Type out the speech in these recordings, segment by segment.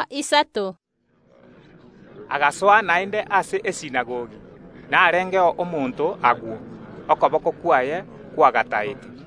Yeso agasoa naende ase esinagogi. Agwo narengeo omonto, okoboko kwaye kwagataete.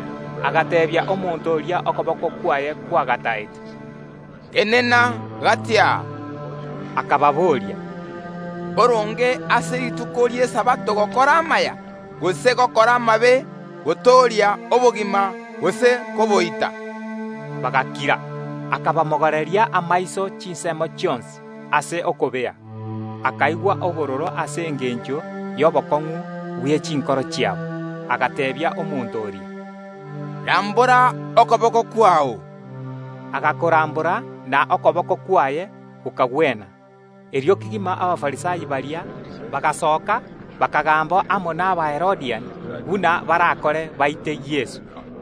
Agateebia omonto oria okoboko kwaye kwagataete, “Tenena gati aa!” Akababoria, “Mboronge ase rituko ri’Esabato gokora amaya, gose gokora amabe; gotooria obogima, gose koboita?” Bagakira. Akabamogoreria amaiso chinsemo chionsi ase okobea, akaigwa obororo ase engencho y’obokong’u bwe chinkoro chiabo, agateebia omonto oria, “Rambora okoboko kwao!” Agakorambora, na okoboko kwaye gokagwena. Erio kegima Abafarisai baria bagasoka, bakagamba amo n’Abaherodiani buna barakore baite Yeso.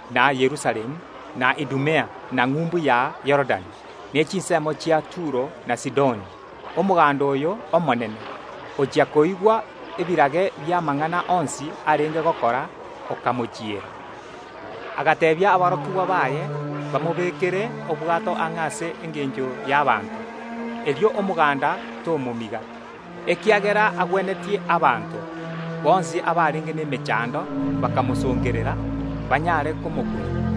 na Yerusalemu, na Idumea, na ng’umbu ya Yorodani, ne chinsemo chia Turo na Sidoni okabatunyana. Ochia koigwa ebirage bi’amang’ana onsi arenge gokora, omoganda oyio omonene, okamochiera. Yeso agateebia aborokigwa baye bamobekere obwato ang’e ase engencho y’abanto; erio omoganda tomomiga. Ekiagera agwenetie abanto, bonsi abarenge nemechando bakamosongerera, banyare komokuna.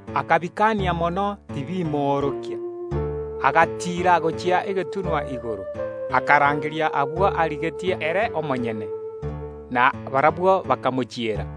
Akabitianera mono tibimoorokia. Erio Yeso agatiira gochia egetunwa igoro, akarangeria abwo arigetie ere omonyene; na barabwo bakamochiera.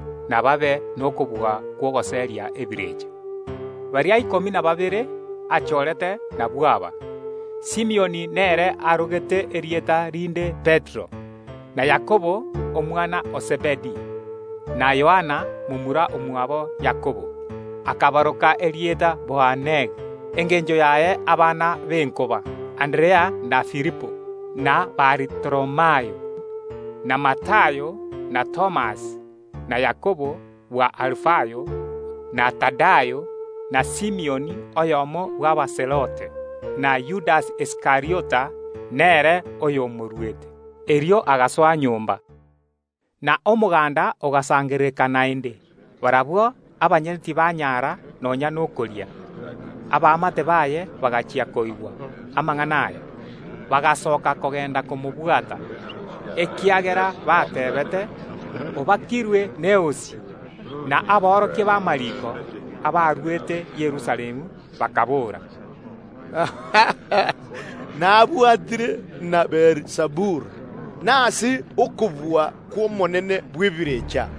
na babe nokobua kw’ogoseria ebirecha. Baria ikomi na babere achoorete nabwo aba: Simioni nere arogete erieta rinde Petero, na Yakobo, omwana o Zebedi, na Yohana, momura omwabo Yakobo, akabaroka erieta Boanergi, engencho yaye: Abana b’enkoba; Anderea na Filipo, na Baritholomayo, na Matayo, na Thomas, na Yakobo bw’Alufayo, na Tadayo, na Simioni, oyomo bw’Abazelote, na Yudasi Iskariota, nere oyomoruete. Erio agasoa nyomba. Na omoganda ogasangerereka naende; barabwo abanyene tibanyara nonya nokoria. Abaamate baye bagachia koigwa amang’ana aya, bagasoka kogenda komobwata, ekiagera bateebete, “Obakirwe n’eosi.” Na aborokia b’amariiko, abarwete Yerusalemu, bakaboora, “Nabwatire na Beelizebuli, naende agoseria ebirecha ase okobua kw’omonene bw’ebirecha.”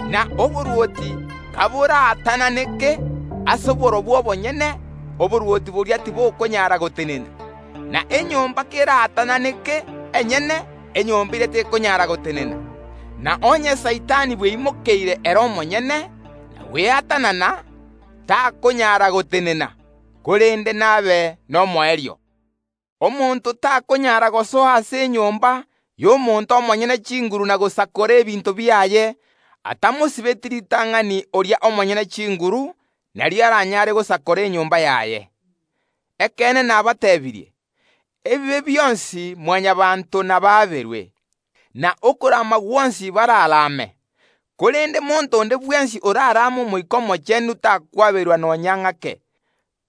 Na oborwoti kaboraatananeke ase borobwo obonyene, oborwoti boria tibokonyara gotenena. Na enyomba keraatananeke enyene, enyomba eria tekonyara gotenena. Na onye Saitani bweimokeire ere omonyene, na gweatanana, takonyara gotenena, korende nabe nomoerio. Omonto takonyara gosoa ase enyomba y’omonto omonyene chinguru na gosakora ebinto biaye, atamosibeti ritang’ani oria omonyene chinguru; nario aranyare gosakora enyomba yaye. “Ekeene nabateebirie: Ebibe bionsi Mwanyabaanto nabaaberwe, na okorama gwonsi bararame, korende monto onde bwensi orarame Omoika Omochenu takwaberwa nonya ng’ake,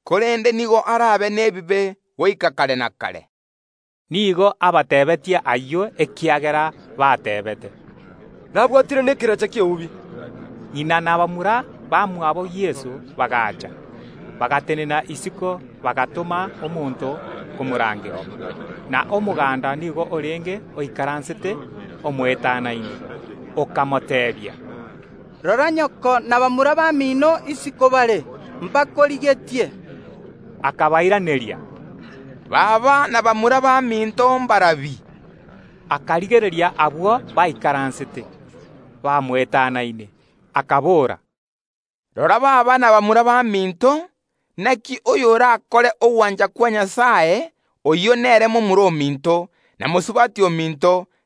korende nigo arabe nebibe goika kare na kare.” Nigo abateebetie ayio ekiagera bateebete, “Nabwatire nekerecha ki’eubi.” Ng’ina na bamura bamwabo Yeso bagaacha, bagatenena isiko, bagatoma omonto komorangeria. Na omoganda nigo orenge oikaransete omoetanaine, okamoteebia, “Rora nyoko na bamura bamino isiko bare, mbagotagete.” Yeso akabairaneria, “Baba na bamura baminto mbarabi?” Akabarigereria abwo baikaransete bamoetanaine, akabora, “Rora aba nabwo baba na bamura baminto! Inaki oyorakore ogwancha kwa Nyasae, oyio nere baba na momura ominto, na mosubati ominto.”